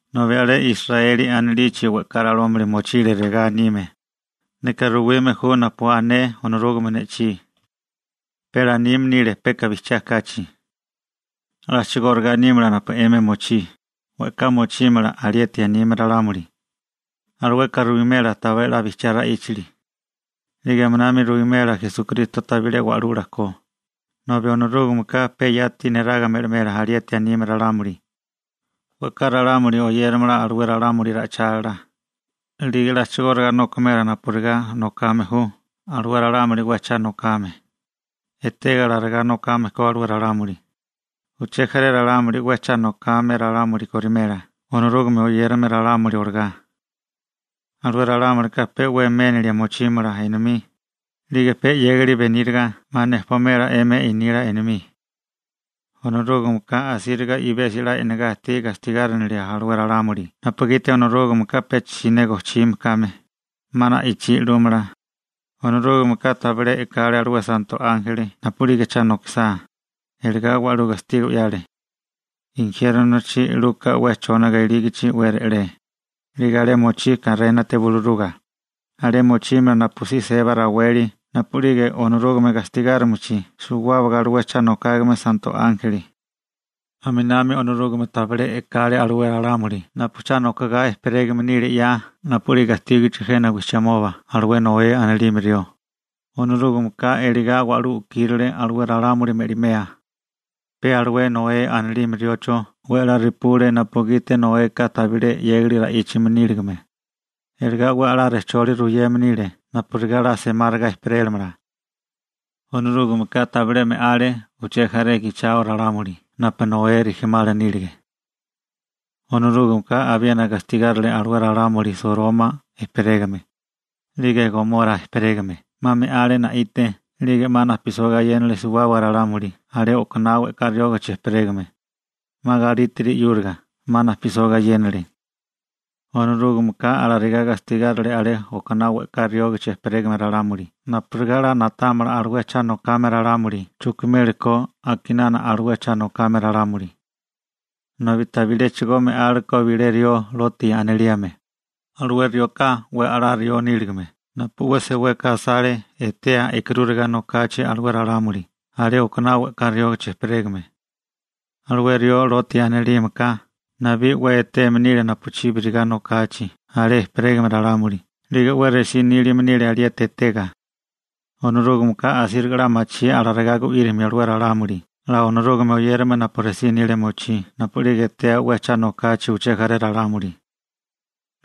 Nobi alé Israeli anilichi we'ká ralámuli mochile regá anime: «Neka ruwime ju napu ané Onorúgame ne'chí.» Pe lanime nile peka bijchiá kachi. A'chigóriga nímala alé napu 'emi mochí, we'ká mochímala alieti anime ralámuli. Alueka ruwimela tabilé 'la bijchiá ra'íchali. 'Lige aminami ruwimela Esukristo tabilé wa'lula ko, nobi Onorúgameka pe yati neraga me'limela alieti anime ralámuli. We'ká ralámuli oyéramala alué ralámuli ra'ichálila, 'lige a'chigóriga nokimela napurigá nokame ju alué ralámuli 'we cha nokame. Etega alarigá nokame ko alué ralámuli, uché jaré ralámuli 'we cha nokame ralámuli korimela Onorúgame oyérame ralámuli olagá. Alué ralámulika pe 'we ménilia mochímala enomí, 'lige pe 'yégali beníriga 'ma nejpomela enomí 'emi nila enomí. Onorúgameka asíriga i'besi 'la e'nagá ajtí gastigárinilia alué ralámuli napugiti Onorúgameka pecha siné gojchime kame, 'ma na'ichí 'lúmala. Onorúgameka tabilé e'kale alué santo ánjeli napu'lige cha nokisá, iligá wa'lú gastigo 'yale, injiérnochi 'luka 'we chóniga ilígichi 'we re'lé, 'lige alé mochí karénate buluruga, alé mochímala napusí seba raweli napu'lige Onorúgame gastigárimichi suwábaga alué cha nokágame santo ánjeli. Aminami Onorúgame tabilé e'kale alué ralámuli napu cha nokogá ejperégame nile 'ya napu'lige ajtígichi jena wijchimoba alué Noé anilime rió, Onorúgameka elegá wa'lú u'kírile alué ralámuli me'limea, pe alué Noé anilime riocho 'we 'la repule napugiti Noeka 'la tabilé 'yégali ra'íchame níligame, iligá 'we 'la rejcholi ruyeme nile napurigá 'la semáriga ejperélamala. Onorúgameka tabilé me'ale uché jaré gichao ralámuli napu Noé rijimala nílige. Onorúgameka abiena gastigárile alué ralámuli Soroma ejperégame 'lige Gomora ejperégame, 'ma me'ale na'ite 'lige 'ma najpisó gayénale suwábaga ralámuli alé okaná we'ká riógichi ejperégame, 'ma galítiri 'yúriga 'ma najpisó gayénale. Onorúgameka alarigá gastigárale alé okaná we'ká riógichi ejperégame ralámuli napurigá 'la na'támala alué cha nokame ralámuli chujkimeli ko a'kinánami alué cha nokame ralámuli. Nobi tabiléchigo me'ale ko bilé rió Loti anilime, alué rioka 'we a'lá rió níligame napu 'we seweka asale etea e'karúriga nokachi alué ralámuli alé okaná we'ká riógichi ejperégame. Alué rió Loti anilímeka nabí 'we eteme nile napuchíbiriga nokachi alé ejperégame ralámuli 'lige 'we resí nílime nile alieti etega. Onorúgameka asíriga 'la machí alarigá gu'írimio alué ralámuli 'la Onorúgame oyérame napu resí nilia mochí napu'lige etea 'we cha nokachi uché jaré ralámuli.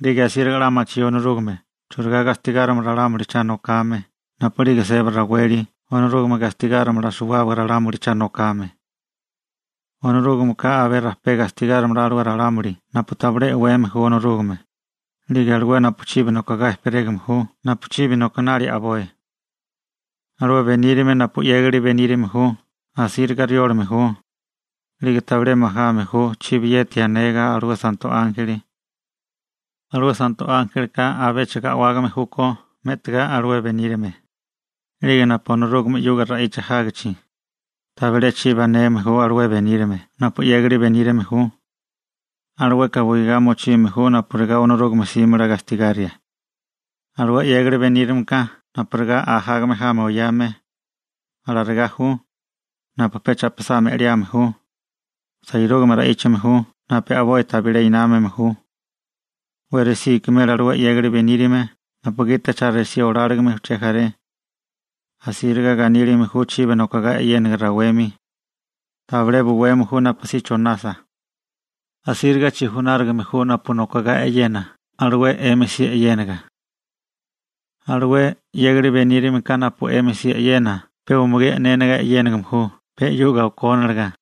'Lige asíriga 'la machí Onorúgame churigá gastigárimio ralámuli cha nokame napu'lige seba raweli Onorúgame gastigárimala suwábaga ralámuli cha nokame. Onorúgameka abé rajpé gastigárimala alué ralámuli napu tabilé e'weme ju Onorúgame, 'lige alué napu chibi nokogá ejperégame ju napu chibi nokinali a'boi. Alué benírame napu 'yégali benírame ju asíriga riólame ju, 'lige tabilé majame ju chibiyeti anega alué santo ánjeli. Alué santo ánjelika abéchigo a'wágame júkó me'tigá alué benírame, 'lige napu'lige Onorúgame 'yuga ra'icha jágichi, tabilé chibi aneme ju alué benírame napu 'yégali benírame ju. Alueka buigá mochime ju napurigá Onorúgame 'símala gastigaria. Alué 'yégali benírameka napurigá ajágame jami oyame, alarigá ju, napu pe cha'pisá me'liame ju. Sairúgame ra'íchame ju napu a'boi tabilé námame ju. 'We resí ikimela alué 'yégali benírame napugiti cha resí oláligime uché jaré. Asíriga ganílime ju chibi nokogá e'yénaga rawemi. Tabilé buweme ju napusí chonasa. Asíriga chijunárigame ju napu nokogá e'yena alué 'emi si e'yénaga. Alué 'yégali benírameka napu 'emi si e'yena pe umugí e'néniga e'yéname ju pe 'yuga okóniliga.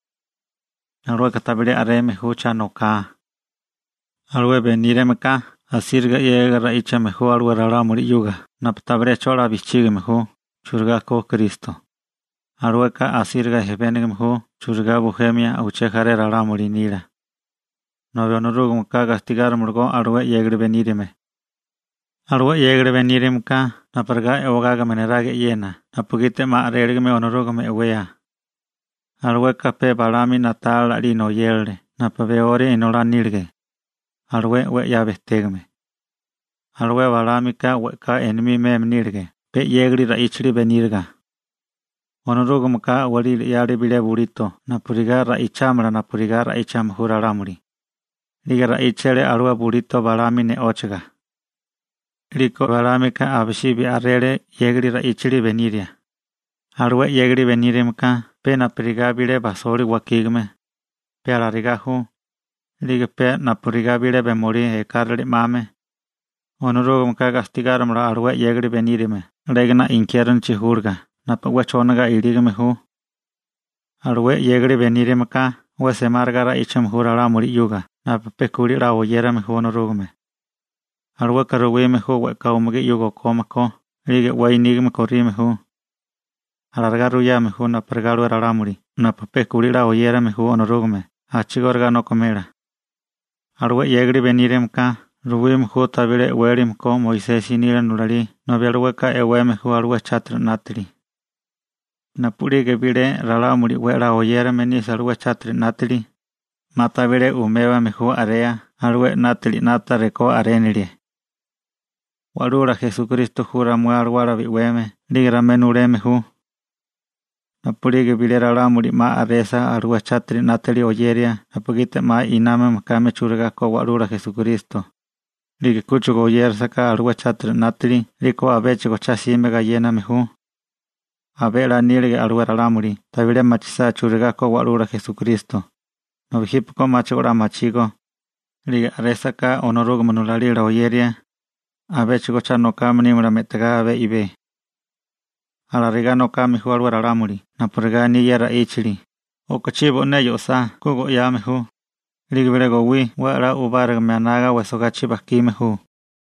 Alueka tabilé a'reme ju cha noká. Alué benírameka asíriga 'yégiga ra'íchame ju alué ralámuli 'yuga napu tabilé 'cho 'la bijchígime ju churigá ko Kristo. Alueka asíriga ejpénigime ju churigá bujemio uché jaré ralámuli nila. Nobi Onorúgameka gastigárimalagó alué 'yégali benírame. Alué 'yégali benírameka napurigá e'wagágame neraga e'yena napugiti 'ma a'réligame Onorúgame e'wea. Alueka pe Balaámi na'tálila 'lina oyérale napu Beori inolá nílige, alué 'we 'ya bejtégame. Alué Balaámika we'ká enomí meme nílige pe 'yégali ra'íchali beníriga. Onorúgameka a'walí 'yale bilé bulito napurigá ra'ichámala napurigá ra'íchame ju ralámuli. 'Lige ra'íchale alué bulito Balaámi ne'óchaga. 'Liko Balaámika abisibi a'rele 'yégali ra'íchali beniria. Alué 'yégali benírameka pe napurigá bilé bajisoli wakígame, pe alarigá ju, 'lige pe napurigá bilé bemolí ekárale 'mame. Onorúgameka gastigárimala alué 'yégali benírame 'légana injiérnochi júliga napu 'we chóniga ilígame ju. Alué 'yégali benírameka 'we semáriga ra'íchame ju ralámuli 'yuga napu pe kulí 'la oyérame ju Onorúgame. Alueka ruwime ju we'ká umugí 'yuga o'kome ko 'lige 'we nígame korime ju. Alarigá ruyame ju napurigá alué ralámuli napu pe kulí 'la oyérame ju Onorúgame a'chigóriga nokimela. Alué 'yégali benírameka ruwime ju tabilé e'wélame ko Moisesi nila nulalí nobi alueka e'weme ju alué chátiri 'nátili. Napu'lige bilé ralámuli 'we 'la oyérame nisa alué chátiri 'nátili, 'ma tabilé umébame ju a'rea alué 'nátili 'nata rekó a'rénilie. Wa'lula Esukristo ju ramué alawala bi'weme 'lige ramué nuleme ju. Napu'lige bilé ralámuli 'ma a'resa alué chátiri 'nátali oyeria napugiti 'ma námame kame churigá ko Wa'lula Esukristo, 'lige kúchigo oyélasaká alué chátiri 'nátili 'liko abéchigo cha'sime gayéname ju. Abé 'la nílige alué ralámuli tabilé machisá churigá ko Wa'lula Esukristo, nobi jípeko 'máchigo 'la machígó, 'lige a'résaká Onorúgame nulalila oyeria, abéchigo cha nokame nímala me'tigá abé i'bé. Alarigá nokame ju alué ralámuli napurigá aní ye ra'íchali: «O'kochí bo'né yo'sá, ku go'yame ju, 'lige bilé gowí 'we 'la u'bárigame anaga wejsogachi bajkime ju.»